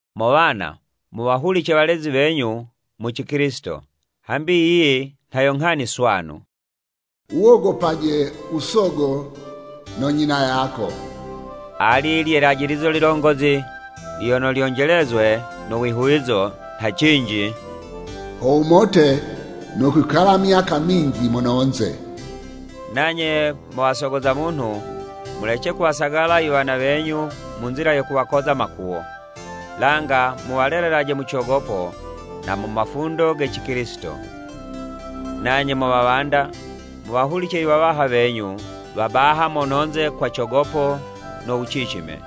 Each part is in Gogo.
Mo wana, muwahulice walezi wenyu mu Cikilisito, hambi yiyi nha yo nghani swanu. “Wuwogopaje u sogo no nyina yako,” ali lye 'lajilizo lilongozi lyono lyonjelezwe no wihuwizo, nha cinji, “Ho wumote no kwikala myaka minji mononze.” Nanye mo wasogo za munhu, mulece kuwasagala iwana wenyu mu nzila yo kuwakoza makuwo, langa muwalelelaje mu cogopo na mu mafundo ge Cikilisito. Nanye mo wawanda, muwahulice iwawaha wenyu wa baha mononze kwa cogopo no wucicime,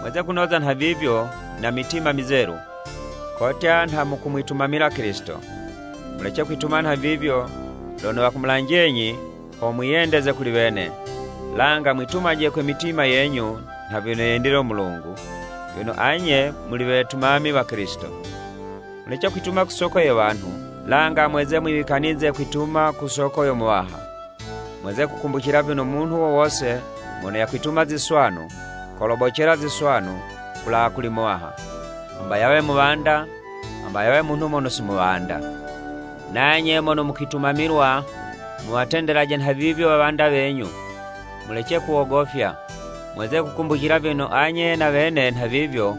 mweze kunoza nhavivyo na mitima mizelu kotya nha mukumwitumamila Kilisito. Mulece kwituma nhavivyo lono wakumulanjenyi ho mwiyendeze kuli wene, langa mwitumaje kwe mitima yenyu nha vyono yendile u Mulungu, vyono anye muli wetumami wa Kilisito. Mulece kwituma ku soko ye wanhu, langa mweze mwiwikanize kwituma ku soko yo Muwaha. Mweze kukumbucila vyono munhu wo wose mono yakwituma ziswanu, kolobocela ziswanu kulawa kuli Muwaha, hamba yawe muwanda, hamba yawe munhu mono si muwanda, Nanye mono mukwitumamilwa, muwatendelaje nhavivyo wawanda wenyu, mulece kuwogofya. Mweze kukumbucila vyono anye na wene nhavivyo,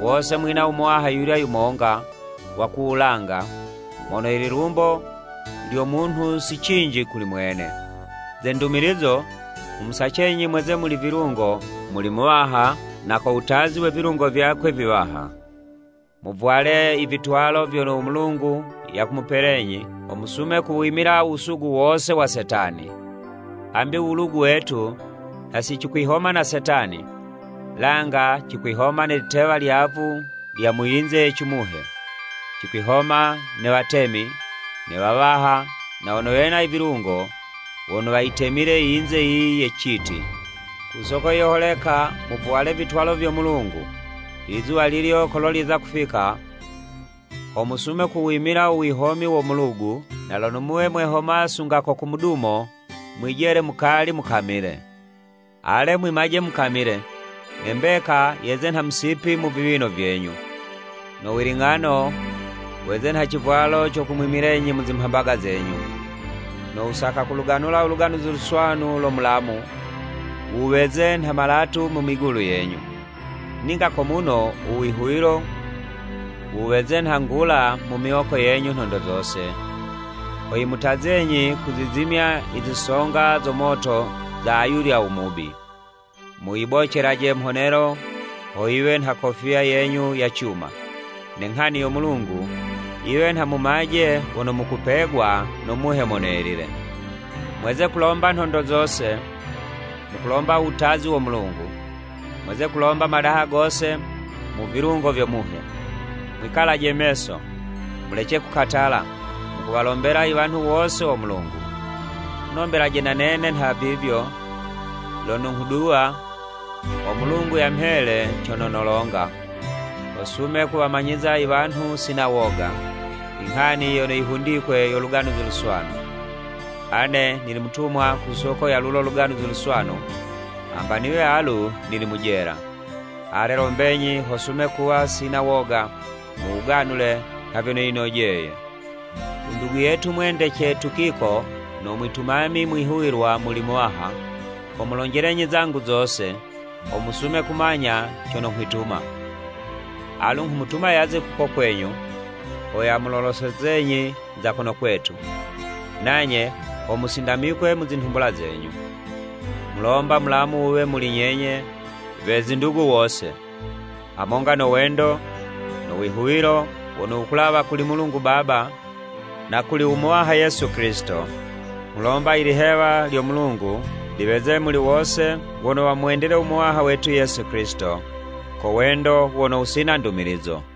wose mwina u Muwaha yuyulya yumonga wa ku wulanga, mono lilumbo lyo munhu si cinji kuli mwene. Ze ndumilizo, nghumusacenyi mweze muli vilungo muli Muwaha na ko wutazi we vilungo vyakwe viwaha. Muvwale i vitwalo vyono u Mulungu yakumupelenyi, ho musume kuwimila u wusugu wose wa Setani. Hambi u wulugu wetu nha si cikwihoma ne wanhu, langa cikwihoma ne litewa lyavu lya mu yinze ye cimuhe, cikwihoma ne watemi, ne wawaha na wono wena i vilungo, wono wayitemile i yinze yiyi ye citi. Ku soko yiyo holeka muvwale vitwalo vyo Mulungu, ilizuwa lilyo kolo lyeza kufika, ho musume kuwimila u wihomi wo mulugu, na lono muwe mwehoma sunga ko ku mudumo, mwijele mukali mukamile. Ale mwimaje mukamile! Ne mbeka yeze nha musipi mu viwino vyenyu, no wiling'ano weze nha civwalo co kumwimilenyi mu zimhambaga zenyu. No wusaka kuluganula u Luganuzi Luswanu lo mulamu, wuweze nha malatu mu migulu yenyu. Ninga ko muno, u wihuwilo, wuweze nha ngula mu miwoko yenyu nhondo zose, ho yimutazenyi kuzizimya i zisonga zo moto za ayulya u mubi. Muyibocelaje mhonelo ho yiwe nha kofiya yenyu ya cuma, ne nghani yo Mulungu yiwe nha mumaje wono mukupegwa no Muhe Mono Yelile. Mweze kulomba nhondo zose, mukulomba u wutazi wo Mulungu. Mweze kulomba madaha gose mu vilungo vyo Muhe. Mwikalaje meso, mulece kukatala, mukuwalombela i wanhu wose wo Mulungu. Munombelaje na nene nha vivyo, lono nghuduwa, ho Mulungu yamhele cono nolonga, ho sume kuwamanyiza i wanhu sina woga, inghani yono yihundikwe yo Luganuzi Luswanu. Ane nili mutumwa ku soko ya lulo Luganuzi Luswanu hamba niwe alu nili mu jela. Ale lombenyi ho sume kuwa sina woga mu wuganule nha vyono yinojeye. U ndugu yetu mwendece Tukiko no mwitumami mwihuwilwa muli Muwaha, komulonjelenyi zangu zose, ho musume kumanya cono nghwituma. Alu nghumutuma yaze kuko kwenyu, ho yamulolosezenyi za kono kwetu, nanye ho musindamikwe mu zinhumbula zenyu. Nghulomba mulamu wuwe muli nyenye we zindugu wose, hamonga no wendo, no wihuwilo wono wukulawa kuli Mulungu Baba na kuli u Muwaha Yesu Kilisito. Nghulomba, ilihewa lyo Mulungu liweze muli wose wono wamwendile u Muwaha wetu Yesu Kilisito ko wendo wono wusina ndumilizo.